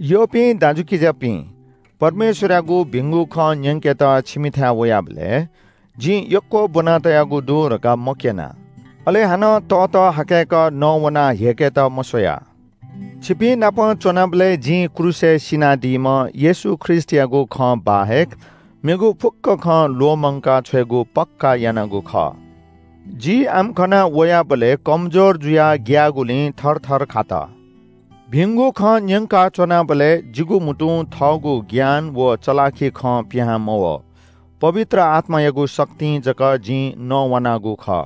यःपिं दाजुकिजापिं, परमेश्‍वरयागु भिंगु खँ न्‍यंकेत छिमिथाय् वयाबलय् जिं यक्‍व ब्‍वना तयागु दु धकाः मक्‍यना, अले हानं ततःहाकय्‌क नवानाः ह्यय्‌केत मस्‍वया। छिपिंनाप च्‍वनाबलय् जिं क्रूसय् सिनादीम्‍ह येशू ख्रीष्‍टयागु खँ बाहेक मेगु फुक्‍क खँ ल्‍वःमंका छ्वयेगु पक्‍का यानागु खः। जि आम्‍कन वयाबलय् कमजोर जुयाः ग्‍याःगुलिं थरथर खात। भिंगु खँ न्‍यंका च्‍वनाबलय् जिगु म्‍हुतुं थःगु ज्ञान व चलाखि खँ पिहां मवः। पवित्र आत्‍मायागु शक्तिं जक जिं नवानागु खः।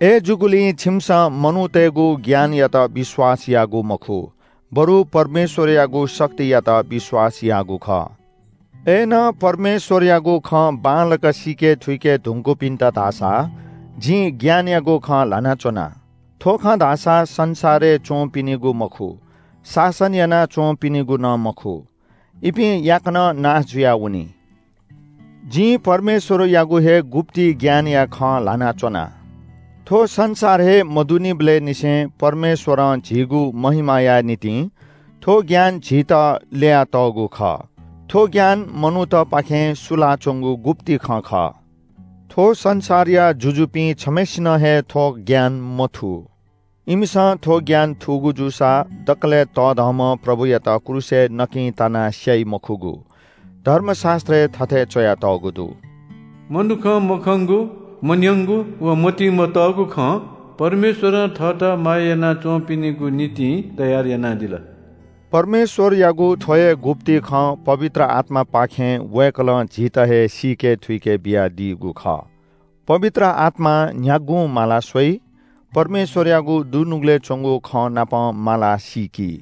अय्‌जूगुलिं छिमिसं मनूतय्‌गु ज्ञानयात विश्‍वास याःगु मखु, बरु परमेश्‍वरयागु शक्तियात विश्‍वास याःगु खः। अय्‌नं परमेश्‍वरयागु खँ बांलाक सीके थुइके धुंकूपिन्‍त धाःसा जिं ज्ञानयागु खँ ल्‍हाना च्‍वना। थ्‍व खँ धाःसा संसारय् च्‍वंपिनिगु मखु, शासन याना च्‍वंपिनिगु नं मखु। इपिं याकनं नाश जुयावनी। जिं परमेश्‍वरयागु हे गुप्‍ति ज्ञानया खँ ल्‍हाना च्‍वना। थ्‍व संसार हे मदुनिबलय् निसें परमेश्‍वरं झीगु महिमाया निंतिं थ्‍व ज्ञान झीत ल्‍ययातःगु खः। थ्‍व ज्ञान मनूतपाखें सुलाच्‍वंगु गुप्‍ति खँ खः। थ्‍व संसारया जुजुपिं छम्‍हय्‌सिनं हे थ्‍व ज्ञान मथू। इमिसं थ्‍व ज्ञान थूगु जूसा दकलय् तःधंम्‍ह प्रभुयात क्रूसय् नकिं तानाः स्‍याइ मखुगु। धर्मशास्‍त्रय् थथे च्‍वयातःगु दु – “मनुखं मखंगु, मन्‍यंगु, व मतिइ मतःगु खँ परमेश्‍वरं थःत माया याना च्‍वंपिनिगु निंतिं तयार यानादिल।” परमेश्‍वरयागु थ्‍व हे गुप्‍ति खँ पवित्र आत्‍मापाखें वय्‌कलं झीत हे सीके थुइके बियादीगु खः। पवित्र आत्‍मां न्‍ह्यागुं माला स्‍वइ, परमेश्‍वरयागु दुनुगलय् च्‍वंगु खँनापं मालाः सीकी।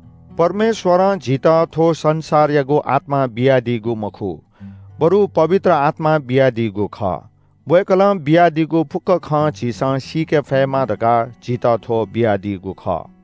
परमेश्‍वरं झीत थ्‍व संसारयागु आत्‍मा बियादीगु मखु, बरु पवित्र आत्‍मा बियादीगु खः। वय्‌कलं बियादीगु फुक्‍क खँ झीसं सीके फयेमा धकाः झीत थ्‍व बियादीगु खः।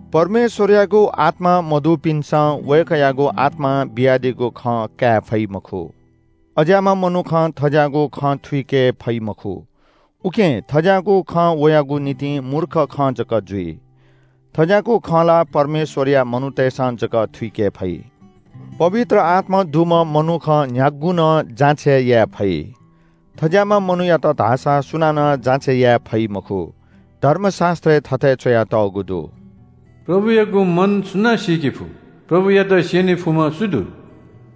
परमेश्‍वरयागु आत्‍मा मदुपिन्‍सं वय्‌कःयागु आत्‍मां बियादीगु खँ काये फइ मखु। अज्‍याःम्‍ह मनुखं थज्‍याःगु खँ थुइके फइ मखु, उकिं थज्‍याःगु खँ वयागु निंतिं मूर्ख खँ जक जुइ। थज्‍याःगु खँ ला परमेश्‍वरया मनूतय्‌सं जक थुइके फइ। पवित्र आत्‍मा दुम्‍ह मनुखं न्‍ह्यागुं नं जाँचय् याये फइ। थज्‍याःम्‍ह मनूयात धाःसा सुनानं जाँचय् याये फइ मखु। धर्मशास्‍त्रय् थथे च्‍वयातःगु दु – “प्रभुयागु मन सुनां सीके फु? प्रभुयात स्‍यने फुम्‍ह सु दु?”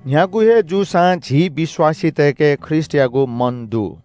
न्‍ह्यागु हे जूसां झी विश्‍वासीतय्‌के ख्रीष्‍टयागु मन दु।